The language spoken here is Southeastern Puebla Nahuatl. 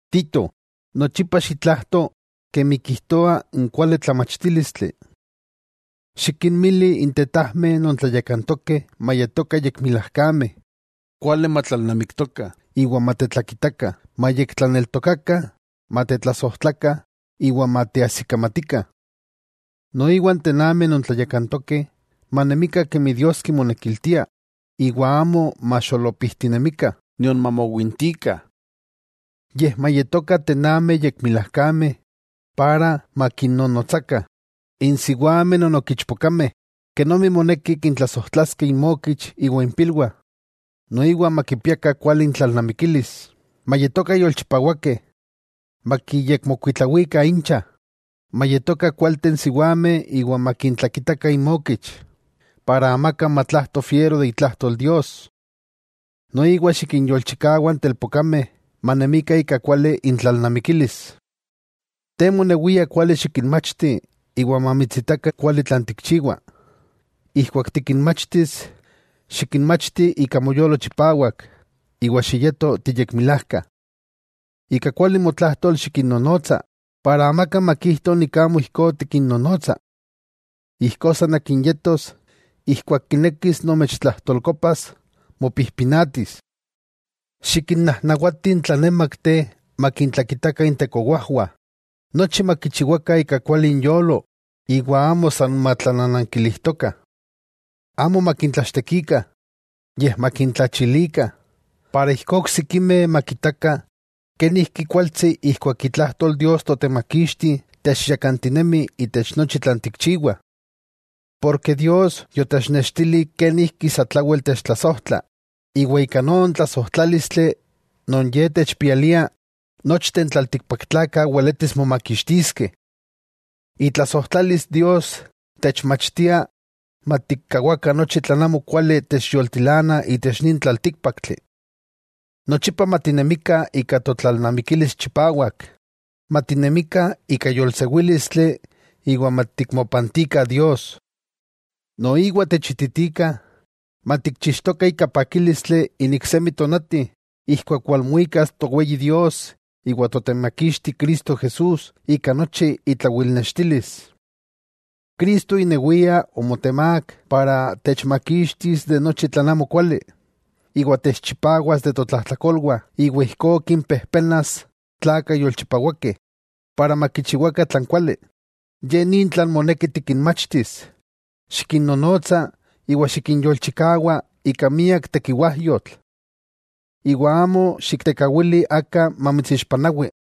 Tito, nochipa xitlajto kemi kijtoa n kuali tlamachtílistli. Xikinmili n tetajmeh non tlayakantokeh mayetokah yekmilajkameh, kuali matlalnamiktokah, iwa matetlakitakah, mayektlaneltokakah, matetlasojtlakah iwa mateajsikamatikah. Noiwa n tenameh non tlayakantokeh manemikah kemi Dios kimonekiltia, iwa amo maxolopijtinemikah, nion mamowintikah. Yej mayetokah tenameh yekmilajkameh para makinnonotsakah n siwameh non ok ichpokameh, kenomi moneki kintlasojtlaskeh inmokich iwa impilwah. Noiwa makipiakah kuali intlalnamikilis, mayetokah yolchipawakeh, makiyekmokuitlawikah incha, mayetokah kualteh n siwameh iwa makintlakitakah inmokich, ijkó amaka kimawistetepewas itlajtol Dios. Noiwa xikinyolchikawa n telpokameh manemikah ika kuali intlalnamikilis. Te monewia kuali xikinmachti iwa mamitsitakah kuali tlan tikchiwa. Ijkuak tikinmachtis, xikinmachti ika moyolo chipawak iwa xiyeto tiyekmilajka. Ika kuali motlajtol xikinnonotsa para amaka makijto amo ijkó tikinnonotsa. Ijkó san akin yetos, ijkuak kinekis nomechtlajtolkopas, mopijpinatis. Xikinnajnawati n tlanémakteh makintlakitakah intekowajwah. Nochi makichiwakah ika kuali inyolo iwa amo san matlananankilijtokah, amo makintlachtekikah, yej makintlachilikah, ijkó oksikimeh makitakah kenijki kualtsi ijkuak itlajtol Dios Totemakixti techyakantinemi itech nochi tlan tikchiwah. Dios, yotechnextili kenijki satlawel techtlasojtla, iwa ika non tlasojtlálistli non Ye techpialia, nochteh n tlaltikpaktlakah weletis momakixtiskeh. Itlasojtlalis Dios techmachtia matikkawakah nochi tlan amokuali techyoltilanah itech nin tlaltíkpaktli. Nochipa matinemikah ika totlalnamikilis chipawak, matinemikah ika yolsewílistli iwa matikmopantikah Dios. Noiwa techititika matikchixtokah ika pakílistli n iksemi tonati ijkuak walmuikas Toweyi Dios iwa Totemakixti Cristo Jesús ika nochi itlawilnextilis. Cristo inewia omotemák para techmakixtis imak nochi tlan amokuali, iwa techchipawas de totlajtlakolwah iwa ijkó kinpejpenas tlakah yolchipawakeh, para makichiwakah tlan kuali. Ye nin tlan moneki tikinmachtis, xikinnonotsa iwa xikinyolchikawa ika miak tekiwajyotl. Iwa amo xiktekawili aka mamitsixpanawi.